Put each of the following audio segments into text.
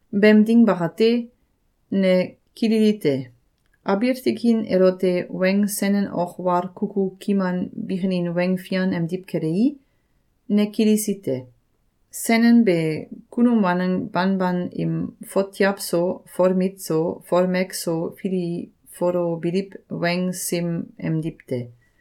Beem ding bakate, ne kililite: Abiil tikin elote weng senen ok wal kuku kiman bikinin weng fian emdiw kelei, ne kilisi te. Senen be kunum waneng banban im fotiaw so, folmit so, folmek so filifolobiliw weng sim emdiw te.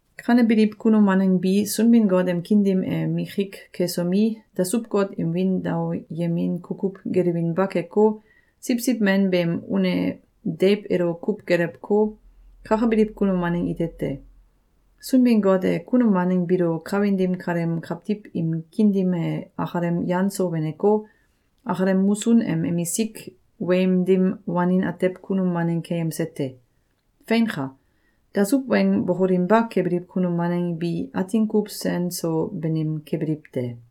Kanebiliw kunum waneng bi, Sunbin-Got em kiin dim e mikik kesomi, dasuw-got im wiin daoyemin kukuw gelewinba keko, Siwsiw Men beem une deiw elo kuw gelewko, kakabiliw kunum waneng ite te. Sunbin-Got e kunum waneng biilo kawin dim kaleem kawtiw im kiin dim e akalem yan so weneko, akalem musun em emisik weim dim wanin atew kunum waneng keyemse te. Feinka! Dasuw weng bokolinba kebiliw kunum waneng bi atin kuw sen so banim kebiliw te.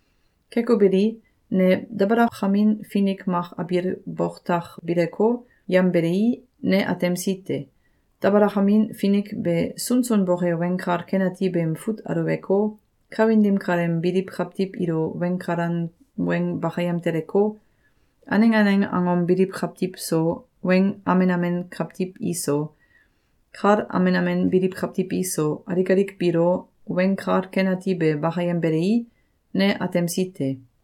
Keko beli, ne dabalakamin finik mak abiil boktak bileko, yambelei, ne atemsi te. Dabalakamin finik be sunsun boke Weng Kal Ken Ati beem fut aluweko, kawin dim kaleem biliw kawtiw ilo weng kalan weng bakayem teleko, aneng aneng angom biliw kawtiw so, weng amen amen kawtiw iso, kal amen amen biliw kawtiw iso, alik alik biilo, Weng Kal Ken Ati be bakayembelei, ne atemsi te.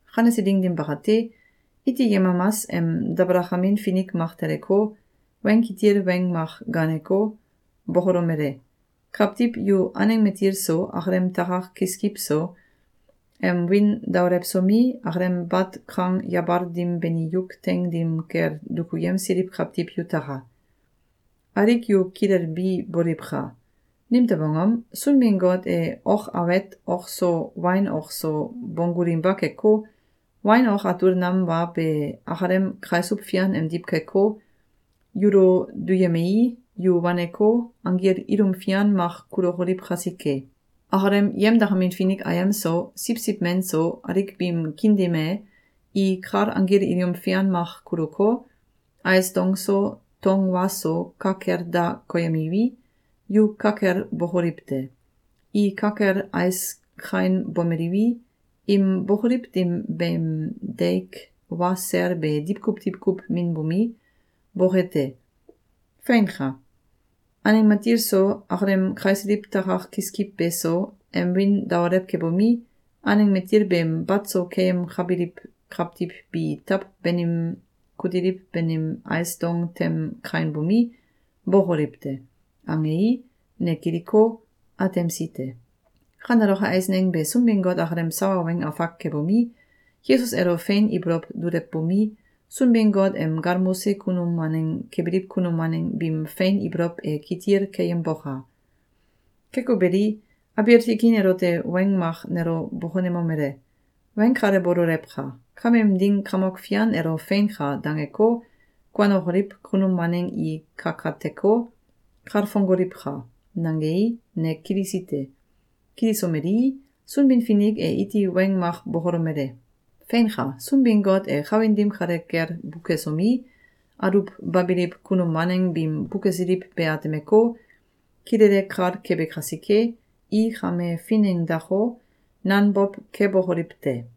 Kanese ding dim bakate, iti yemamas em dabalakamin finik mak teleko, weng kitil weng mak gaaneko, bokolomele: “Kawtiw yu aneng matil so, akalem takak kiskiw so, em wiin daolewsomi, akalem bat kang yabal dim beni yuk teing dim kel dukuyemsiliw kawtiw yutaka! Alik yu kilelbi boliwka! Nimtew angom? Sunbin-Got e ok awet ok so wain ok so bonggulinba keko, wain ok atul nam wa be akalem kaisuw fian emdiw keko, yulo duyemei, yu waneko, anggil ilum fian mak kulokoliw kasike. Akalem yemdakamin finik ayem so, Siwsiw Men so, alik biim kiin dim e, i kal anggil ilum fian mak kulko, ais dong so, tong wa so ka kel da koyemiwi, yu ka kel bokoliw te. I ka kel ais kainbomeliwi, im bokoliw dim beem deik wa sel be diwkuw diwkuw minbomi, boke te. Feinka! Aneng matil so, akalem kaisiliw takak kiskiw beso, em wiin daolew kebomi, aneng matil beem bat so keyemkabiliw kawtiw bi taw banim kutiliw banim ais dong tem kainbomi, bókoliw te!”, angei, ne kiliko, atemsi te. Kaneloke eisneng be Sunbin-Got akalem sawa weng afak kebomi, Yesus elo fein ibolow dulewbomi, Sunbin-Got em galmose kunum waneng kebiliw kunum waneng biim fein ibolow e kitil keyemboka! Keko beli, abiil tikin elote weng mak nelo bokonemomele: “Weng kale bololewka! Kameem ding Kamok Fian elo ‘Feinka!’, dangeko, kuanokoliw kunum waneng i kakateko, kalfongoliwka!”, nangei, ne kilisi te. Kilisomelii, Sunbin-Finik e iti weng mak bokolomele: “Feinka! Sunbin-Got e kawin dim kale kel bukesomi, aluwbabiliw kunum waneng biim bukesiliw be atemeko, kilele kal kebe kasike, i kame finengdako, nanbow kebokoliw te.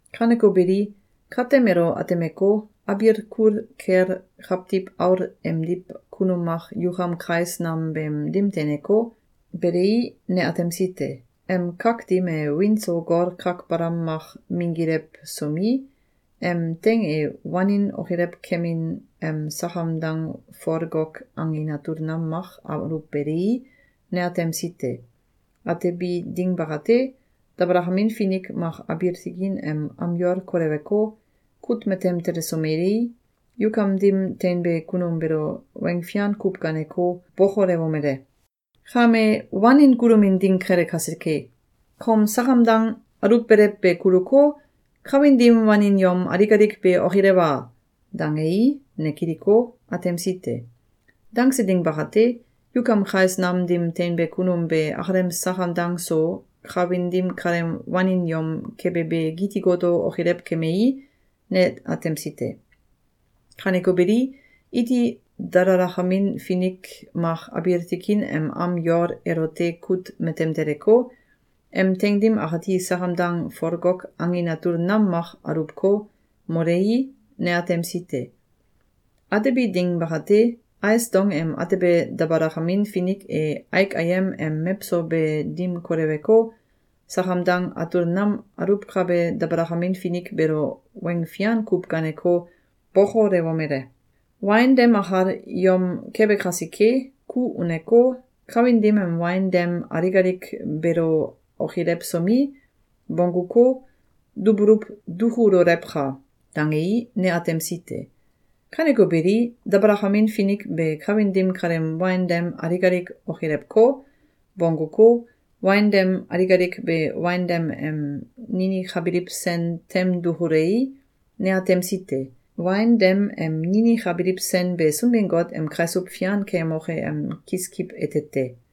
Kaneko beli, katem elo atemeko, abiil kul kel Kawtiw Aul emdiw kunum mak yukam kais nam beem dim teineko, belei, ne atemsi te. Em kak dim e wiin so gol kak balam mak minggilewsomi, em teing e wanin okilew kemin em sakam dang folgok angin atul nam mak aluwbelei, ne atemsi te. Atebi ding bakate, dabalakamin finik mak abiil tikin em am yol koleweko, kut matem telesomelei, yukam dim teinbe kunum beelo weng fian kuw gaaneko, bokolewomele: “Kame wanin kulomin ding kele kasike, kom sakam dang aluwbelew be kuluko, kawin dim wanin yom alik alik be okilewa!”, dangei, ne kiliko, atemsi te. Dangse ding bakate, yukam kais nam dim teinbe kunum be akalem sakam dang so kawin dim kaleem wanin yom kebe be giti goto okilew kemei, ne atemsi te. Kaneko beli, iti dalalakamin finik mak abiil tikin em am yol elote kut matem teleko, em teing dim akati sakam dang folgok angin atul nam mak aluwko, molei, ne atemsi te. Atebi ding bakate, ais dong em atebe dabalakamin finik e aik ayem em mewso be dim koleweko, sakam dang atul nam aluwkabe dabalakamin finik beelo weng fian kuw gaaneko, bokolewomele: “Wain dem akal yom kebe kasike, ku uneko, kawin dim em wain dem alik alik beelo okilewsomi, bongguko, dubuluw dukulolewka!”, dangei, ne atemsi te. Kaneko beli, dabalakamin finik be kawin dim kaleem wain dem alik alik okilewko, bongguko, wain dem alik alik be wain dem em ninikabiliw sen tem dukulei, ne atemsi te. Wain dem em ninikabiliw sen be Sunbin-Got em kaisuw fian keyemoke em kiskiw ete te.